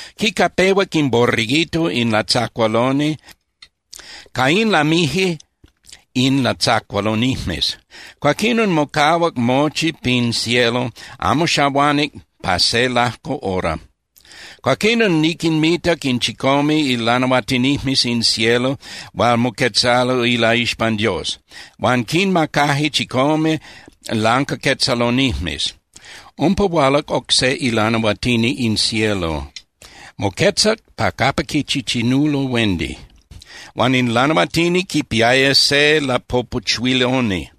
Quicapehuac in Borreguito in latzacualoni, ca in lamije in latzacualonijmes. Cuaquinon mocahuac mochi pin cielo, amo xahuanic pa se lajco hora. Cuaquinon niquinmitac in chicome ilanahuatinijmes in cielo hual moquetzalo ilaixpan Dios. Huan quinmacaje chicome lancaquetzalonijmes. Umpa hualac oc se ilanahuatini in cielo, moquetzac pa capa quichichinulo huendi. Huan in lanahuatini quipiaya se lapopuchuiloni.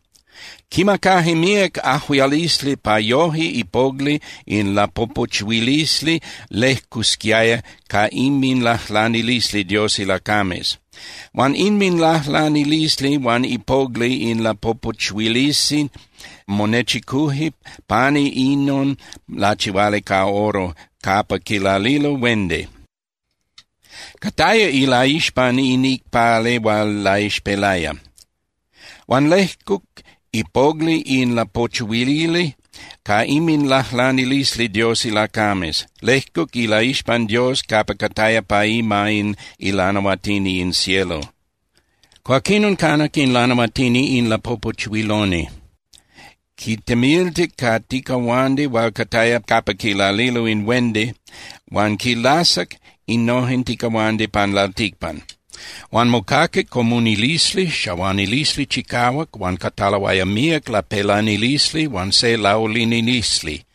Quimacaje míac ajuialisli pa yoje ipogli in lapopuchuilisli lejcusquiaya ca inminlajlanilisli Dios ilacames. Huan inminlajlanilisli huan ipogli in lapopuchuilisli monechicuje pani inon lachihuali ca oro capa quilalilo huendi. Cataya ilaixpan in icpali hual laixpelaya. Huan lejcuc ipogli in lapopuchuili ca inminlajlanilisli Dios ilacames, lejcuc ilaixpan Dios capa cataya pa ima in ilanahuatini in cielo. Cuaquinon canac in lanahuatini in lapopuchuiloni. Quitemiltic ca ticahuandi hual cataya capa quilalilo huendi huan quilasac innojen ticahuandi pan lalticpan. Huan mocaquic comunilisli, xahuanilisli chicahuac, huan cataloaya míac lapelanilisli huan se laulinilisli.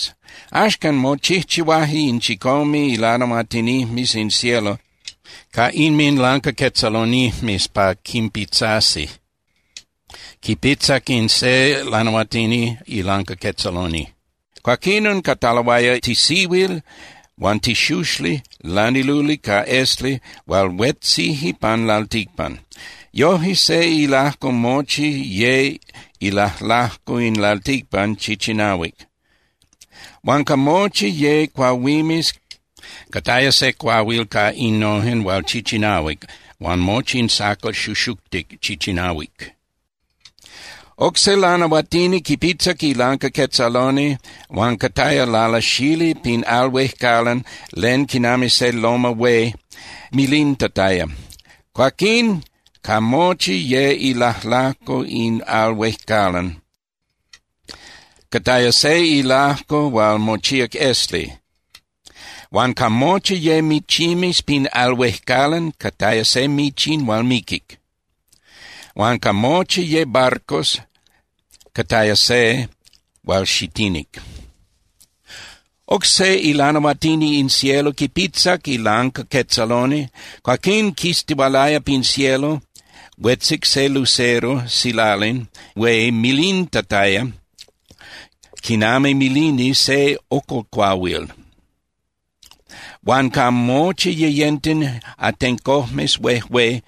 Axcan mochijchihuaje in chicome ilanahuatinijmes in cielo ca inminlancaquetzalonijmes pa quinpitzasi. Quipitzac in se lanahuatini ilancaquetzaloni. Cuaquinon cataloaya tisihuil huan tixuxli laniluli ca esli hual huetzije pan lalticpan. Yoje, se ilajco mochi ye ilajlajco in lalticpan chichinahuic. Huan ca mochi ye cuahuimes, cataya se cuahuil ca innojen hual chichinahuic, huan mochi in sacal xuxuctic chichinahuic. Oc se lanahuatini quipitzac ilancaquetzaloni huan cataya lalasali pin al huejcalan len quinami se loma hué (tepel) milintataya. Cuaquín ca mochi ye ilajlajco in al huejcalan, cataya se ilajco hual mochíac esli, huan ca mochi ye michimes pin al huejcalan, cataya se michin hual miquic, huan ca mochi ye barcos, cataya se hual xitinic. Oc se ilanahuatini in cielo quipitzac ilancaquetzaloni. Cuaquín quistihualaya pin cielo, huetzic se lucero (silalin) hué milintataya quinami milini se ocolcuahuil. Huan ca mochi yeyenten atencojmes huejué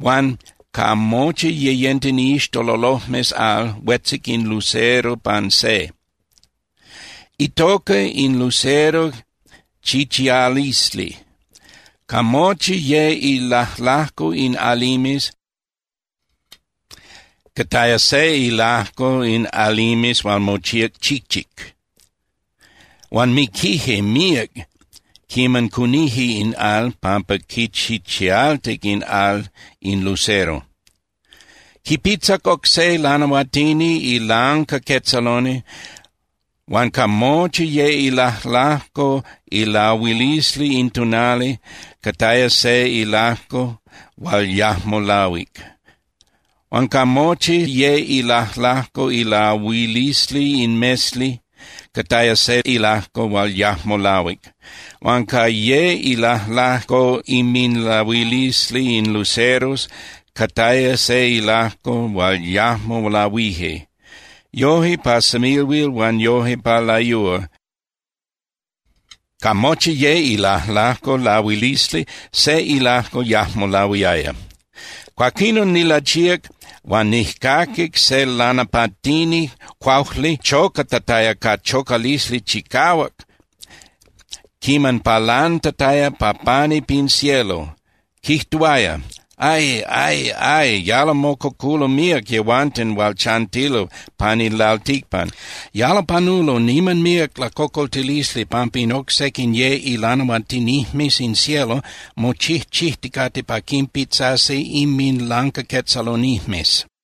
huan ca mochi yeyenten iixtololojmes al, huetzic in lucero pan se. Itoca in lucero Chichialisli. Ca mochi ye ilajlajco in alimes, cataya se ilajco in alimes hual mochíac chichic. Huan miquije míac quiman cunije in al pampa quichichialtic in al in lucero. Quipitzac oc se lanahuatini ilancaquetzaloni huan ca mochi ye ilajlajco ilahuilisli in tonali, cataya se ilajco hual yajmo lahuic. Huan ca mochi ye ilajlajco ilahuilisli in mesli, cataya se ilajco hual yajmo lahuic. Huan ca ye ilajlajco inminlahuilisli in luceros, cataya se ilajco hual yajmo lahuije. Yoje pa semilhuil huan yoje pa layúa, ca mochi ye ilajlajco ilahuilisli, se ilajco yajmo lahuiaya. Cuaquinon nilachíac huan nijcaquic se lanapatini (cuaujli) chocatataya ca chocalisli chicahuac quiman palantataya pa pani pin cielo, quijtuaya: —¡Ay, ay, ay! ¡Yalo mococulo míac yehuanten hual chantilo pan in lalticpan! ¡Yalo panulo niman míac lacocoltilisli pampa in oc sequin ye ilanahuatinijmes in cielo mochijchijticate pa quinpitzasi inminlancaquetzalonijmes!